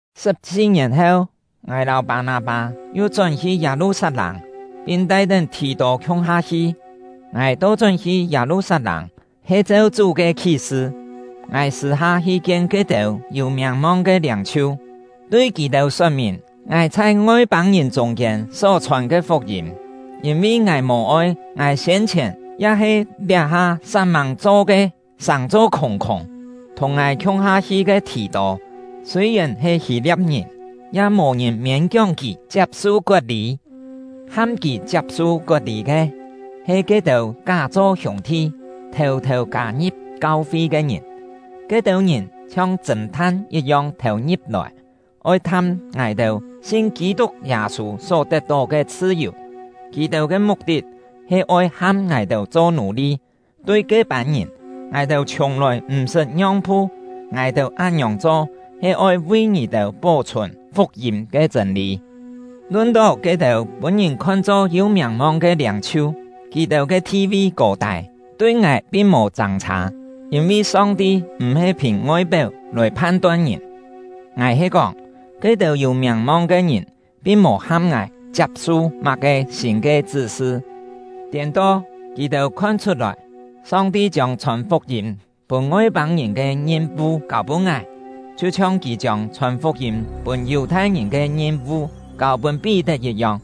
Sṳ̍p-si-ngièn heu, ngài lâu Pâ-nâ-pâ yu chón-hi Yâ-lu-sat-lâng, pin tai-tén Thì-tô khiung-ha hi; ngài to-chón hi Yâ-lu-sat-lâng, he cheu Chú ke khí-sṳ. Ngài sṳ̂-ha hi kien ke-têu yû miàng-mong ke liâng-chhiu, tui kì-têu sot-mìn ngài chhai Ngoi-pâng-ngìn chûng-kiên só-chhòn ke fuk-yîm; yîn-vi ngài mò-oi ngài siên-chhièn ya-he liá-ha sat-mâng cho ke sàng-cho khûng-khûng. Thùng ngài khiung-ha hi ke Thì-tô, sûi-yèn he Hî-lia̍p-ngìn, ya mò-ngìn miên-kióng kì chiap-su kot-lî; ham kì chiap-su kot-lî ke, he ke-têu ká-cho hiûng-thi, thêu-thêu kâ-ngi̍p kau-fi ke ngìn. Ke-têu ngìn chhiong chṳ̂n-tham yit-yong thêu-ngi̍p-lòi, oi tham ngài-têu sin Kî-tuk Yâ-sû só tet-tó ke chhṳ-yù; kì-têu ke muk-tit he oi ham ngài-têu cho nù-li. Tui ke-pân ngìn, ngài-têu chhiùng-lòi m̀-sṳt ngiong-phu; ngài-têu án-ngiòng cho, he oi vi ngì-têu pó-chhùn fuk-yîm ke chṳ̂n-lî. Lun-tó ke-têu pûn ngìn khon-cho yû miàng-mong ke liâng-chhiu (kì-têu ke thi-vi kô-tâi tui ngài pin mò châng-chhâ, yîn-vi Song-ti m̀-he phìn ngoi-péu lòi phan-ton ngìn), ngài he kóng, ke-têu yû miàng-mong ke ngìn pin mò ham ngài chiap-su má-ke sîn ke chṳ́-sṳ; tiên-to, kì-têu khon-chhut-lòi: Song-ti chiông chhòn fuk-yîm pûn Ngoi-pâng-ngìn ke ngim-vu kâu-pûn ngài, chhiu-chhiong Kì chiông chhòn fuk-yîm pûn Yù-thai-ngìn ke ngim-vu kâu-pûn Pí-tet yit-yong.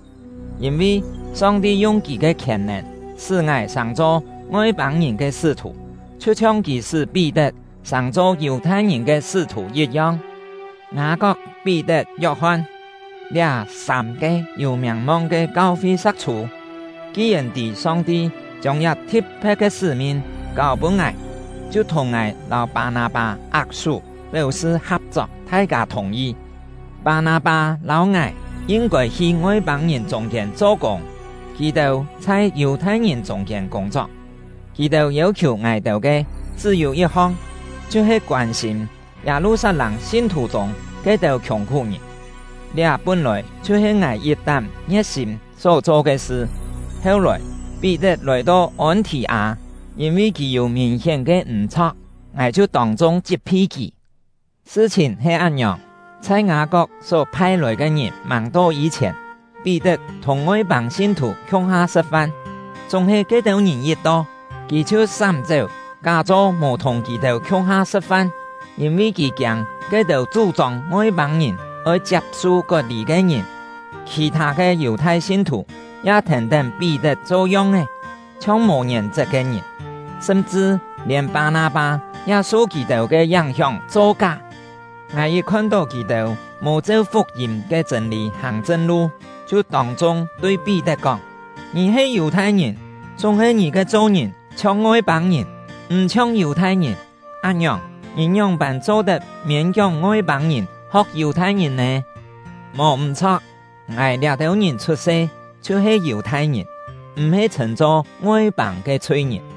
Yîn-vi, Song-ti yung Kì ke khièn-nèn sṳ́ ngài sàng-cho Ngoi-pâng-ngìn ke sṳ́-thù, chhiu-chhiong Kì sṳ́ Pí-tet sàng-cho Yù-thai-ngìn ke sṳ́-thù yit-yong. Ngâ-kok, Pí-tet, Yok-hon, liá sâm-ke yû miàng-mong ke kau-fi sa̍k-chhû, ki-yèn tî Song-ti chiông liá thi̍t-phe̍t ke sṳ́-min kâu-pûn ngài, chhiu thùng ngài lâu Pâ-nâ-pâ ak-sú, péu-sṳ ha̍p-chok; thai-kâ thùng-yi: Pâ-nâ-pâ lâu ngài yin-kôi hi Ngoi-pâng-ngìn chûng-kiên cho-kûng, kì-têu chhai Yù-thai-ngìn chûng-kiên kûng-chok. Kì-têu yêu-khiù ngài-têu ke chṳ́-yû yit-hong, chhiu-he koân-sîm Yâ-lu-sat-lâng sin-thù chûng ke-têu khiùng-khú-ngìn; liá pún-lòi chhiu-he ngài yit-tán ngie̍t-sîm só-cho ke sṳ. Heu-lòi, Pí-tet lòi-to Ôn-thì-â; yîn-vi kì yû mìn-hién ke m̀-chho̍k, ngài chhiu tông-chung chit-phi kì. Sṳ-chhìn he án-ngiòng: Chhai Ngâ-kok só phai-lòi ke ngìn màng to yî-chhièn, Pí-tet thùng Ngoi-pâng sin-thù khiung-ha sṳ̍t-fan; chúng-he ke-têu ngìn yit to, kì chhiu sám-chéu, ká-cho mò thùng kì-têu khiung-ha sṳ̍t-fan, yîn-vi kì kiâng ke-têu chú-chông Ngoi-pâng-ngìn oi chiap-su kot-lî ke ngìn. Khì-thâ ke Yù-thai sin-thù ya thèn-tén Pí-tet cho yong-é, chhiong mò ngièn-chet ke ngìn; sṳm-chṳ lièn Pâ-nâ-pâ ya su kì-têu ke yáng-hióng cho ká. Ngài yit khon-tó kì-têu mò cheu fuk-yîm ke chṳ̂n-lî hàng chṳn-lu, chhiu tông-chung tui Pí-tet kóng: “Ngì he Yù-thai-ngìn, chúng-he ngì ke cho-ngìn chhiong Ngoi-pâng-ngìn, m̀ chhiong Yù-thai-ngìn. Án-ngiòng, ngì ngióng-pân cho-tet miên-kióng Ngoi-pâng-ngìn ho̍k Yù-thai-ngìn nè?” Mò m̀-chho̍k, ngài liá-têu ngìn chhut-se chhiu-he Yù-thai-ngìn, m̀-he chhṳ̂n-cho “Ngoi-pâng ke chhui-ngìn”.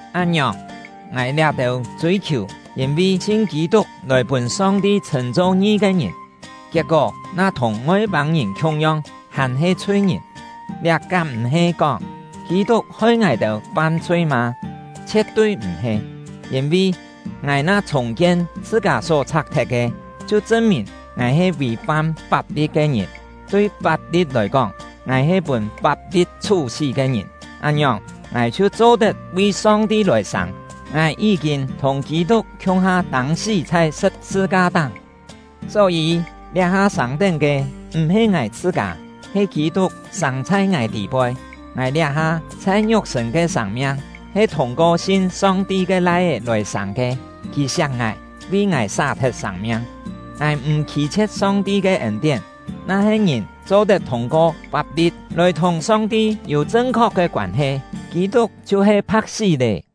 Án-ngiòng, ngài liá-têu chûi-khiù yîn-vi sin Kî-tuk lòi pûn Song-ti chhṳ̂n-cho ngi ke ngìn, kiet-kó na thùng Ngoi-pâng-ngìn khiung-yong hàn-he chhui-ngìn, liá kám m̀-he kóng Kî-tuk hoi ngài-têu fam-chhui mâ? Chhie̍t-tui m̀-he! Yîn-vi, ngài na chhùng-kien chhṳ-kâ só chhak-thet ke, chhiu chṳn-mìn ngài he vì-fam fap-li̍t ke ngìn. Tui fap-li̍t lòi kóng, ngài he pûn fap-li̍t chhú-sí ke ngìn; án-ngiòng, ngài chhiu cho-tet vi Song-ti lòi sâng. Ngài yí-kîn thùng Kî-tuk khiung-ha tâng-sí chhai sṳ̍p-sṳ-ka-táng, só-yî, liá-ha sâng-tén ke m̀-he ngài chhṳ-kâ, he Kî-tuk sâng chhai ngài tî-poi. Ngài liá-ha chhai ngiuk-sṳ̂n ke sâng-miang he thûng-ko sin Song-ti ke Lai-é lòi sâng ke; kì siak ngài, vi ngài sá-thet sâng-miang. Ngài m̀ khî-chhie̍t Song-ti ke ên-tién; na-he ngìn cho-tet thûng-ko fap-li̍t lòi thùng Song-ti yû chṳn-khok ke koân-he, Kî-tuk chhiu he pha̍k-sí lé!